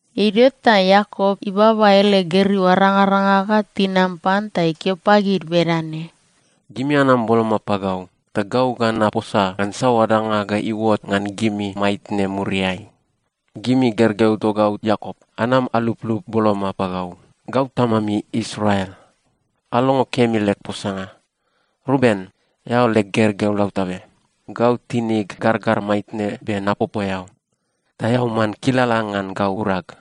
Idio ta Iakop ibaba ele gergeu arangaranga ga tinam pan ta ikeo pagid bedane, “Gimi anam boloma pagau, ta gau ga naposa ngan saoa danga ga iuot ngan gimi maitne muriai. “Gimi gergeu togau Iakop, anam aluplup boloma pagau. Gau tamami Israel, alongo kemi leg posanga. “Ruben, eao leg gergeu lautabe. Gau tinig gargar maitne be napopo eao, ta eao man kilala ngan gau urag.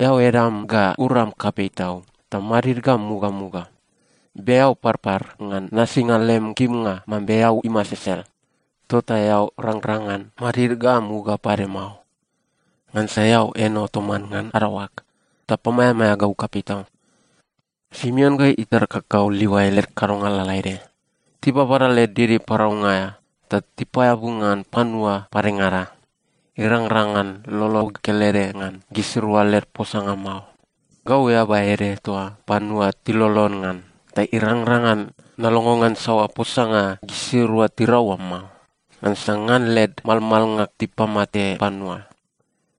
Eao edam ga uram kapei tau, ta madid ga mugamuga. Be eao parpar ngan nasinga lem kimnga mambe eau imasesel. Tota eao rangrang ngan madid ga muga pade mao, ngansa eao eno toman ngan adaoag, ta pamaeamaea gau kapei tau. “Simeon ga itar kakau Livai led kadonga lalaede, tibabada led didi paraunga aea ta tipaeabu ngan panua padengada. Irangrang ngan lolog kelede ngan gisirua led posanga mao. Gau eaba ede toa panua tilolon ngan, ta irangrang ngan nalongo ngan saoa posanga gisirua tirau oa mao. Ngansa ngan led malmalnga tipamate panua.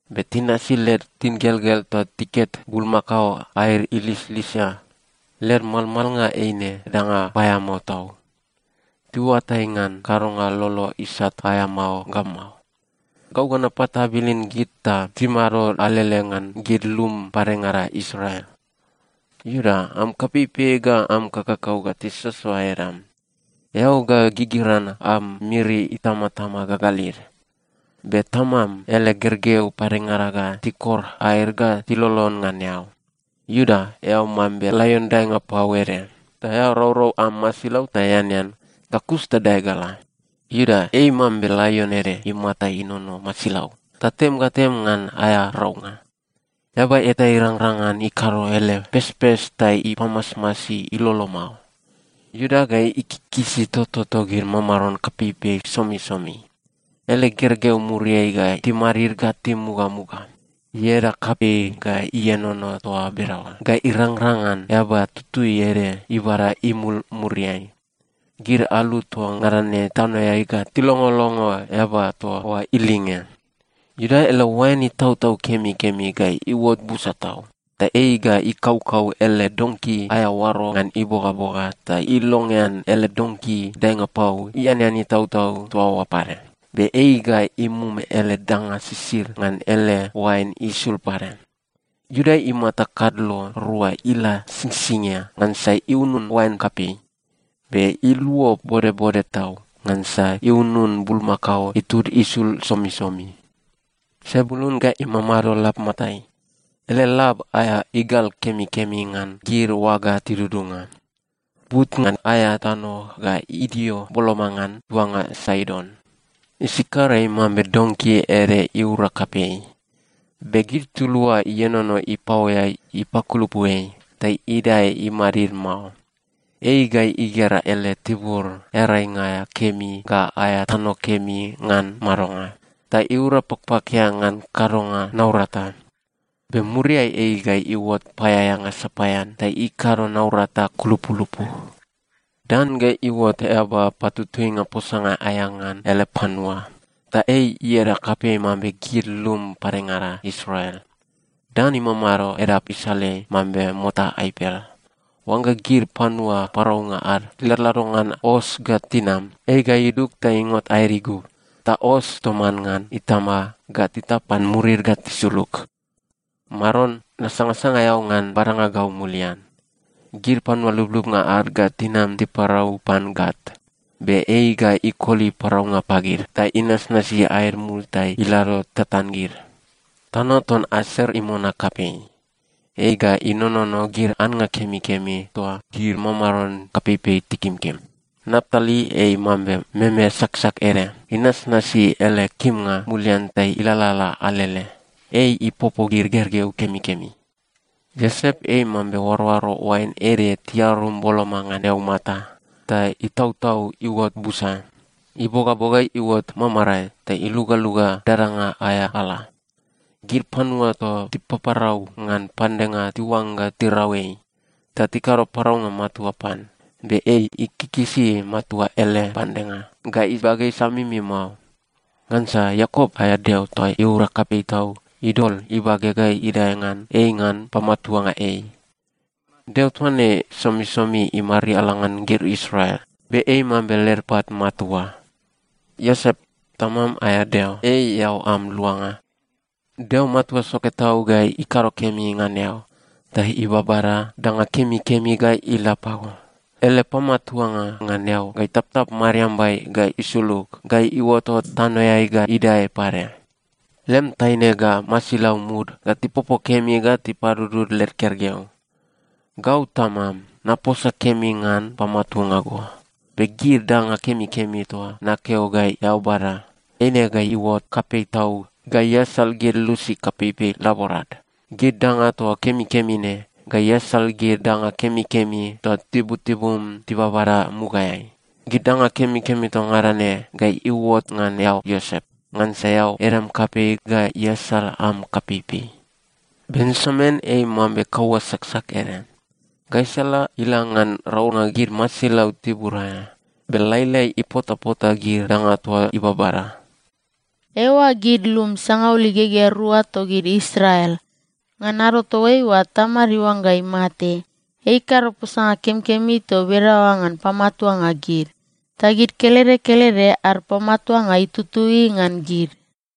Be tinasi led tingelgel ta tiket bulmakao aed ilislisia. Led malmalnga eine danga paeamao tau. Tiuatai ngan kadonga lolo isat aea mao ga mao. Gau ga napatabilin gid ta timado alele ngan gid lum padengada Israel. “Iuda, am kapeipei ga am kakakau ga tisoasoa edam. Eao ga gigiran am miri itamatama gagalid. Be tamam ele gergeu padengada ga tikor aed ga tilolon ngan eao. Iuda, eao mambe laion daenga pau ede, ta eao raurau am masilau ta eanean, ga kus ta dae ga la. Iuda ei mambe laion ede imata inono masilau, ta tem ga tem ngan aea raunga. Eaba eta irangrang ngan ikado ele pespes ta ipamasmasi ilolo mao. Iuda ga ikikisi toto togid mamaron kapeipei somisomi. Ele gergeu muriai ga timadid ga timugamuga. Ieda kapei ga ienono toa bedaoa ga irangrang ngan eaba tutui ede ibada imul muriai. Gid alu toa ngada ne tanoeai ga tilongolongo eaba toa oa ilinge. Iuda ele oain itautau kemikemi ga iuot busa tau, ta ei ga ikaukau ele donki aea oaro ngan ibogaboga, ta ilongean ele donki daenga pau ianean itautau toa oa pade. Be ei ga imum ele danga sisid ngan ele oain isul pade. Iuda imata kadlo rua ila singsingia, ngansa iunun oain kapei. Be iluo bodbode tau, ngansa iunun bulmakao itud isul somisomi. “Sebulun ga imamado lab matai. Ele lab aea igal kemikemi ngan gid oaga tidudunga. But ngan aea tano ga idio boloma ngan tuanga Saidon. “Isakar ei mambe donki ede iura kapei. Be gid tulua ienono ipaoeai ipakulupu ei, ta idae imadid mao. Ei ga igera ele tibur earainga aea kemi ga aea tano kemi ngan madonga, ta iura pakpakia ngan kadonga naurata. Be muriai ei ga iuot paeaeanga sapaean ta ikado naurata kulupulupu. “Dan ga iuot eaba patutuinga posanga aea ngan ele panua. Ta ei ieda kapei mambe gid lum padengada Israel. Dan imamado edap isaleai mambe mota aipel. Oangga gid panua paraunga ad tiladlado ngan os ga tinam, ei ga idug ta ingot aed igub, ta os toman ngan itama ga titap pan murid ga tisulug. “Maron, nasangasanga eao ngan badanga gau mulian. “Gid panua lublubnga ad ga tinam tiparau pan Gat, be ei ga ikoli paraunga pagid, ta inasnasi aed mul ta ilado tatan gid. “Tano ton Aser imona kapei. Ei ga inonono gid annga kemikemi toa gid mamaron kapeipei tikimkim. “Naptali ei mambe meme saksak ede, inasnasi ele kimnga mulian ta ilalala alele. Ei ipopo gid gergeu kemikemi. “Iosep ei mambe oaroaro oain ede tiarum boloma ngan eaumata, ta itautau iuot busa. Ibogaboga iuot mamarae ta ilugaluga dadanga aea ala. Gid panua toa tipaparau ngan pandenga tiuangga tirau ei ta tikado paraunga matua pan. Be ei ikikisi matua ele pandenga, ga ibage isamimi mao. Ngansa Iakop aea Deo toa iura kapei tau idol ibage ga idae ngan ei ngan pamatuanga ei. Deo toa ne somisomi imariala ngan gid Israel, be ei mambe led pat matua. Iosep, tamam aea Deo, ei eao am luanga. Deo Matua Soke Tau ga ikado kemi ngan eao ta ibabada danga kemikemi ga ila pago. Ele pamatuanga ngan eao ga itaptap mariambai ga isulug ga iuotot tanoeai ga idae pade. Lem taine ga masilau mud ga tipopo kemi ga tipadudud led gergeu. Gau tamam, naposa kemi ngan pamatuanga go, be gid danga kemikemi toa nakeo ga eao bada, eine ga iuot kapei tau ga iasal gid lusi kapeipei laborad. Gid danga toa kemikemi ne ga iasal gid danga kemikemi toa tibutibum tibabada mugaeai. Gid danga kemikemi toa ngada ne ga iuot ngan eao Iosep, ngansa eao edam kapei ga easal am kapeipei. “Benjamin ei mambe kaua saksak ede. Gaisala ila ngan raunga gid masilau tibur aea, be lailai ipotapota gid danga toa ibabada.” Eiua gid lum sangaul igegea rua togid Israel. Ngan ado toaiua tamad iuangga imate, ei ikado posanga kemikemi toa bedaoa ngan pamatuanga gid. Ta gid kelede kelede ad pamatuanga itutui ngan gid.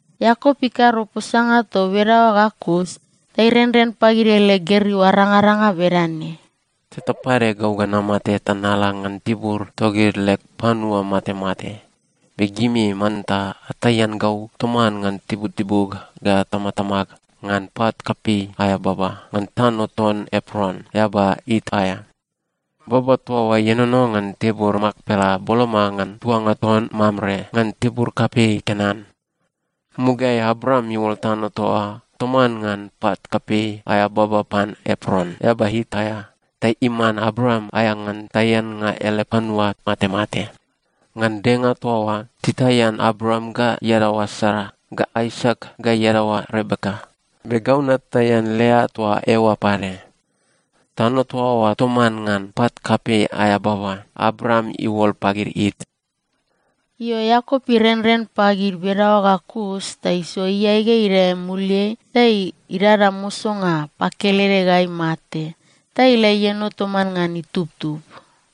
Iakop ikado posanga toa bedaoa ga kus, ta irenren pagid ele gergeu arangaranga bedane, “Teta pade gau ga namate ta nala ngan tibur togid leg panua matemate. Be gimi manta ataian gau toman ngan tibutibug ga tamatamag ngan pat kapei aea baba, ngan tano ton Epron, eaba It aea. Baba toa oa ienono ngan tibur Makpela boloma ngan tuanga ton Mamre ngan tibur kapei Kenan. Mugaeai Abraam iuol tano toa oa toman ngan pat kapei aea baba pan Epron, eaba It aea, ta iman Abraam aea ngan taiannga ele panua matemate. Ngan denga toa oa, titaian Abraam ga iadaoa Sara, ga Aisak ga iadaoa Rebeka, be gau nataian Lea toa eoa pade. Tano toa oa toman ngan pat kapei aea baba, Abraam iuol pagid It.” Io, Iakop irenren pagid bedaoa ga kus ta isoa iae ga idae imuliai ta idada mosonga pakelede ga imate ta ila ieno toman ngan itubtub.